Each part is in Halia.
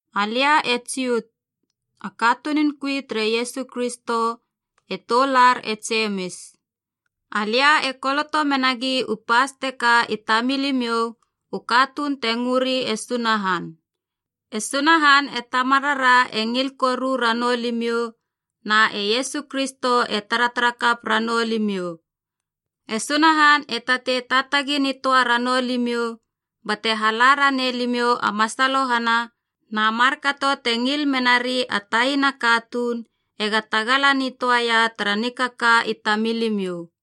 Alia e Jut, a katunun kui tere Iesu Kristo, e toular e Jemis. Alia e koloto menagi u pas teka i tamilimiou, u katuun te ngöri e Sunahan. E Sunahan e Tamarara e ngil koru ranou limiou, na e Iesu Kristo te taratara kap ranou limiou. E Sunahan e tatei taatagi nitöa ranou limiou bate hala ranei limiou a masalohana, na markato te ngil menari a taina katuun ega tagala nitöaia tara nikaka i tamilimiou.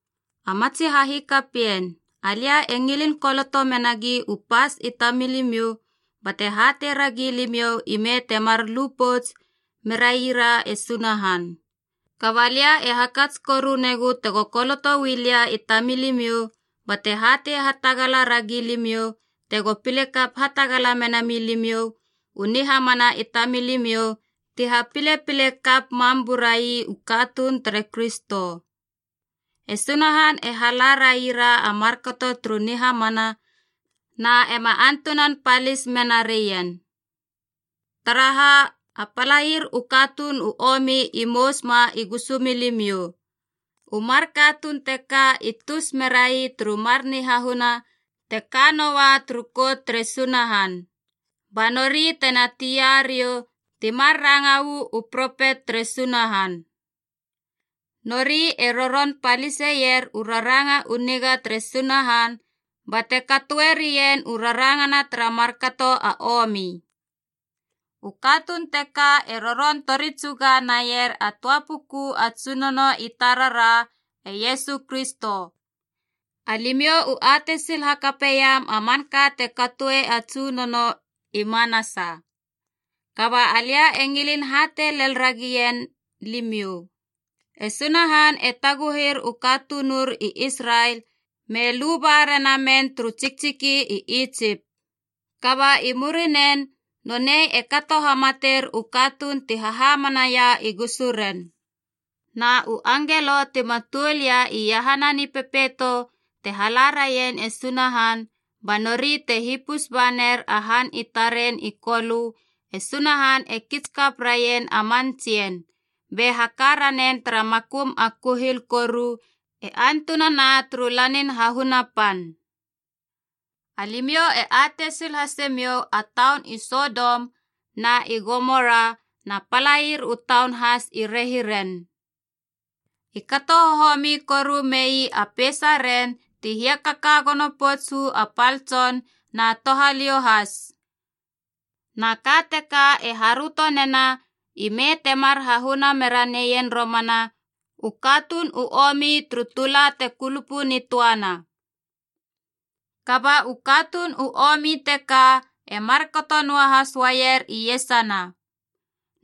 A matsi hahikapien, alia e ngilin koloto menagi u pas i tamilimiou bate hatei ragi limiou ime temar lu pouts meraira e Sunahan. Kaba lia e hakats koru negu tego koloto uu lia i tamilimiou bate hatei hatagala ragi limiou tego pile kap hatagala mena milimiou u nihamana i tamilimiou ti hapilepile kap mam burai u katuun tere Kristo. E Sunahan e hala raira a markato turu nihamana na ema antunan palis menarien. Taraha, a palair u katuun u omi i mous ma i gusu milimiou. U mar katuun teka i tus merai turu mar nihahuna te ka noua turu kout tere Sunahan, ba nori tena tia riou, ti mar ranga uu propet tere Sunahan. Nori e roron paliseier u raranga u niga tere Sunahan bate katoerien u rarangana tara markato a omi. U katuun teka e roron tori tsuga naier a töa puku a Tsunono i tarara, e Iesu Kristo. Alimiou u atei sil hakapeiam a manka te katoi a Tsunono i manasa, kaba alia e ngilin hatei lel ragien limiou. E Sunahan e taguhir u katunur i Israel me luba rena men turu tsiktsiki i Itsip. Kaba i murinen nonei e kato hamatir u katuun ti hahamanaia i gusuren. Na u angelo tima tuol ia iahana nipepeito te halarien e Sunahan, ba nori te hipus ba ner a han i taren i Kolö, e Sunahan e kits kap raien a man tsien, be haka ranen tara makum a kuhil koru e antunana turu lanin hahuna pan. Alimiou e atei sil hase miou a taun i Sodom na i Gomora na palair u taun has i rehiren. U katuun ti kaia tara man han teka i kato hohomi koru mei a peisaren ti hiakaka gono pouts u a pal tson na touhaliou has. Na ka teka e haröto nena ime temar hahuna mera neien romana, u katuun u omi turu tula te kulupu nitöana. Kaba u katuun u omi teka e markato noahas uaier iesana.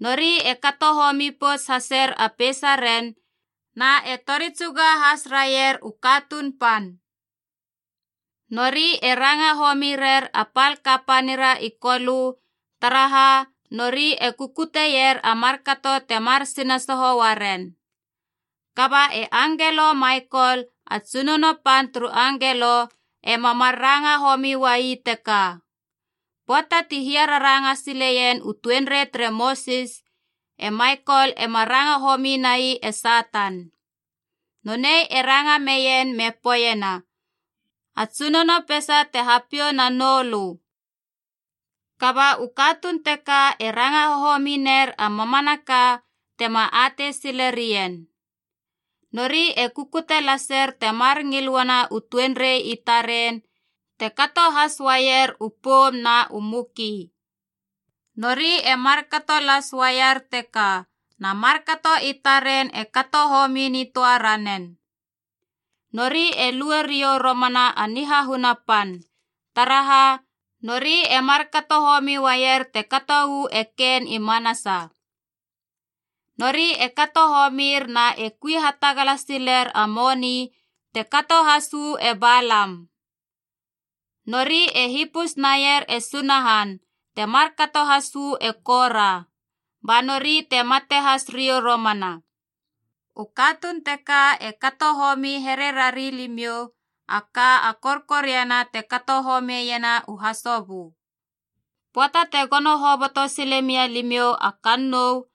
Nori e kato homi pouts haser a peisaren na e tori tsuga has raier u katuun pan. Nori e ranga homi rer a pal kapanira i Kolö, taraha nori e kukutier a markato temar sinasoho uaren. Kaba e angelo Maikol, a tsunono pan turu angelo, ema mar ranga homi uai teka. Pöata ti hiararanga sileien u tuenrei tere Mosis, e Maikol ema ranga homi nai e Satan. Nonei e ranga meien me poeiena, “A Tsunono peisa te hapiou na noulö.” Kaba u katuun teka e ranga hohomi ner a mamanaka tema atei silerien. Nori e kukute laser temar ngil uana u tuenrei i taren, te kato has uaier u poum na u muki. Nori e markato las uaier teka, na markato i taren e kato homi nitöa ranen. Nori e lue riou romana a nihahuna pan. Taraha, nori e markato homi uaier te kato uu e Kein i manasa. Nori e kato homir na e kui hatagala siler a moni, te kato has uu e Balam. Nori e hipus naier e Sunahan, te markato has uu e Kora. Ba nori te mate has riou romana. U katuun teka e kato homi here rari limiou, a ka a korkoriana te kato homiena u hasobö. Pöata te gono hoboto sile mia limiou a kannou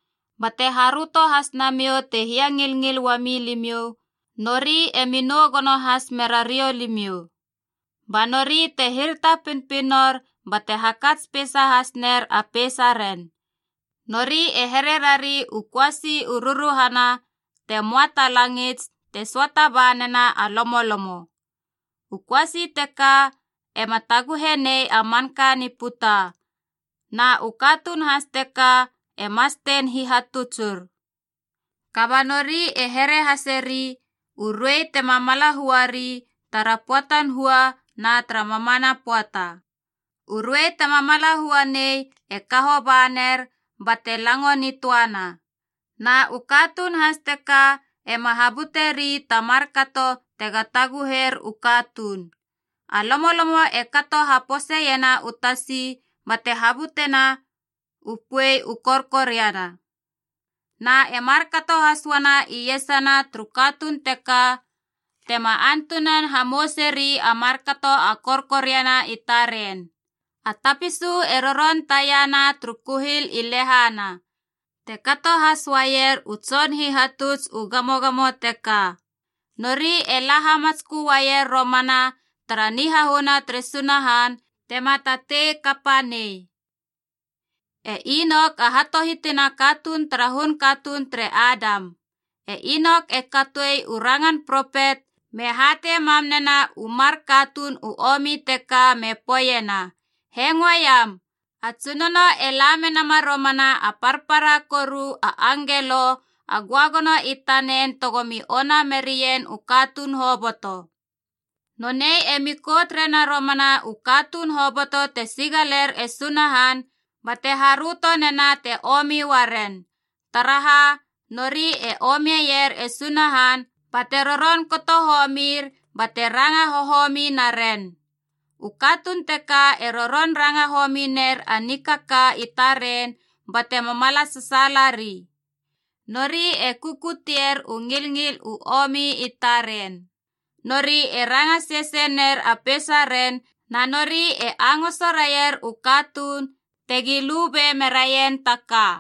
bate haröto has nemiou te hiangilngil uami limiou, nori emi nou gono has mera riou limiou. Ba nori te hirata pinopinor bate hakats peisa has ner a peisaren. Nori e here rari u köasi u ruruhana te möa ta langits te söata ba nena a lomolomo. U köasi teka ema taguhe nei a manka ni puta, na u katuun has teka e mastein hihatutsur. Kaba nori e here haseri a ruei tema mala huari tara pöatan hua na tara mamana pöata. U ruei tema mala hua nei e kaho ba ner, bate lango nitöana. Na u katuun has teka ema habuteri ta markato tega taguhir u katuun. A lomolomo e kato haposeiena u tasi bate habutena u puei u korkoriana. Na e markato has uana iesana turu katuun teka tema antunan hamouseri a markato a korkoriana i taren. A tapisu e roron tiana turu kuhil i lehana. Te kato has uaier u tson hihatuts u gamogamo teka. Nori e la hamatskö uaier romana tara nihahuna tere Sunahan tema tatei kapa nei. E Inok a hatohitinaa a katuun tara hun katuun tere Adam. E Inok e katoi u rangan propet me hatei mam nena u mar katuun u omi teka me poeiena, “Hengo iam. A Tsunono e la menama romana a parpara koru a angelo a göagono i tanen tegomi ona merien u katuun hoboto. Nonei emi kout rena romana u katuun hoboto te sigaler e Sunahan bate haröto nena te omi uaren, taraha nori e omier e Sunahan bate roron kato homir bate ranga hohomi naren.” U katuun teka e roron ranga homi ner a nikaka i taren bate mamala sasaalari. Nori e kukutier u ngilngil u omi i taren. Nori e ranga sesei ner a peisaren na nori e angoso raier u katuun tegi lube meraien ta ka.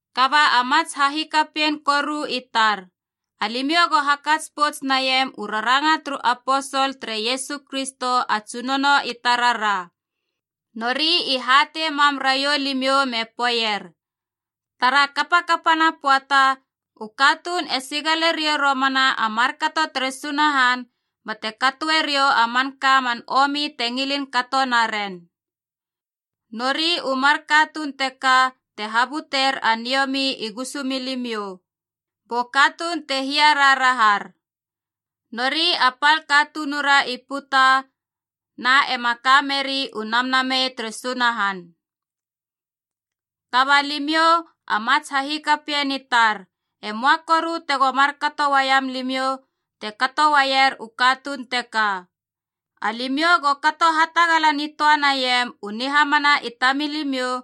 Kaba a mats hahikapien koru i tar, alimiou go hakats pouts naiam u raranga turu aposol tere Iesu Kristo a Tsunono i tarara. Nori i hatei mam raiou limiou me poeier, “Tara kapakapana pöata, u katuun e sigale riou romana a markato tere Sunahan bate katoe riou a manka man omi te ngilin kato naren.” Nori u mar katuun teka te habuter a niomi i gusumilimiou, bu katuun te hia raharahar. Nori a pal katunura i puta, na ema ka meri u Namnamei tere Sunahan. Kaba limiou, a matsi hahikapien i tar, e möa koru tego markato uaiam limiou te kato uaier u katuun teka. Alimiou go kato hatagala nitöa naiam u nihamana i tamilimiou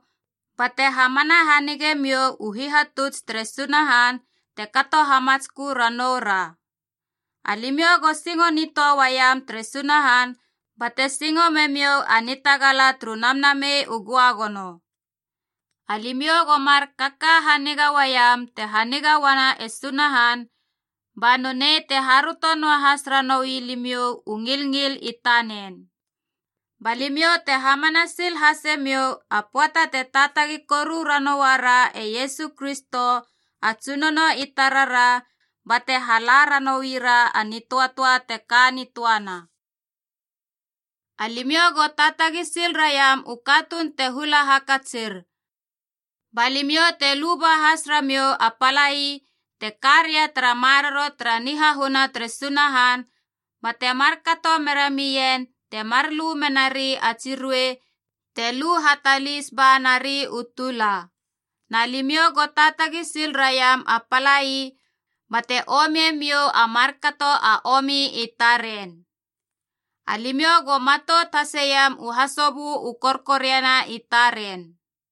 bate hamana hanige miou u hihatuts tere Sunahan te kato hamatskö ranoura. Alimiou go singo nitöa uaiam tere Sunahan, bate singo memiou a nitagala turu Namnamei u Göagono. Alimiou go mar kaka haniga uaiam te haniga uana e Sunahan, ba nonei te haröto noahas ranoui limiou u ngilngil i tanen. Ba limiou te hamana sil hase miou a pöata te taatagi koru ranouara e Iesu Kristo a Tsunono i tarara bate hala ranoira a nitöatöa te ka nitöana. Alimiou go taatagi sil raiam u katuun te hula hakatsir. Ba limiou te luba has ramiou a palai te ka ria tara maroro tara nihahuna tere Sunahan, bate markato mera mien temar lu menari a tsi ruei te lu hatalis ba nari u tula. Na limiou go taatagi sil raiam a palai bate omie miou a markato a omi i taren. Alimiou go matout haseiam u hasobö u korkoriana i taren.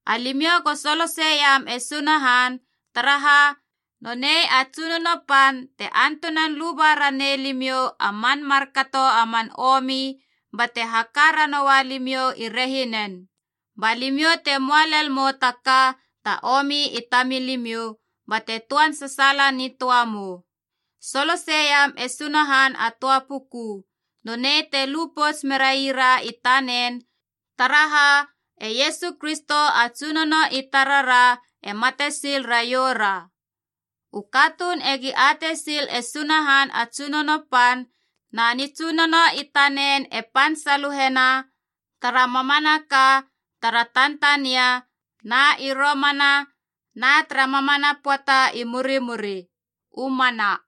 Alimiou go soloseiam e Sunahan, taraha nonei a Tsunono Pan te antunan luba ranei limiou a man markato a man omi bate haka ranoua limiou i rehinen. Ba limiou te möa lel mou ta ka ta omi i tamilimiou, bate töan sasaala nitöa mou. Soloseiam e Sunahan a töa puku. Nonei te lu pouts meraira i tanen, taraha e Iesu Kristo a Tsunono i tarara e mate sil raioura. U katuun egi atei sil e Sunahan a Tsunono Pan, na Nitsunono i tanen e pan saluhena tara mamanaka, tara tantania, na i romana, na tara mamana pöata i murimuri. U mana.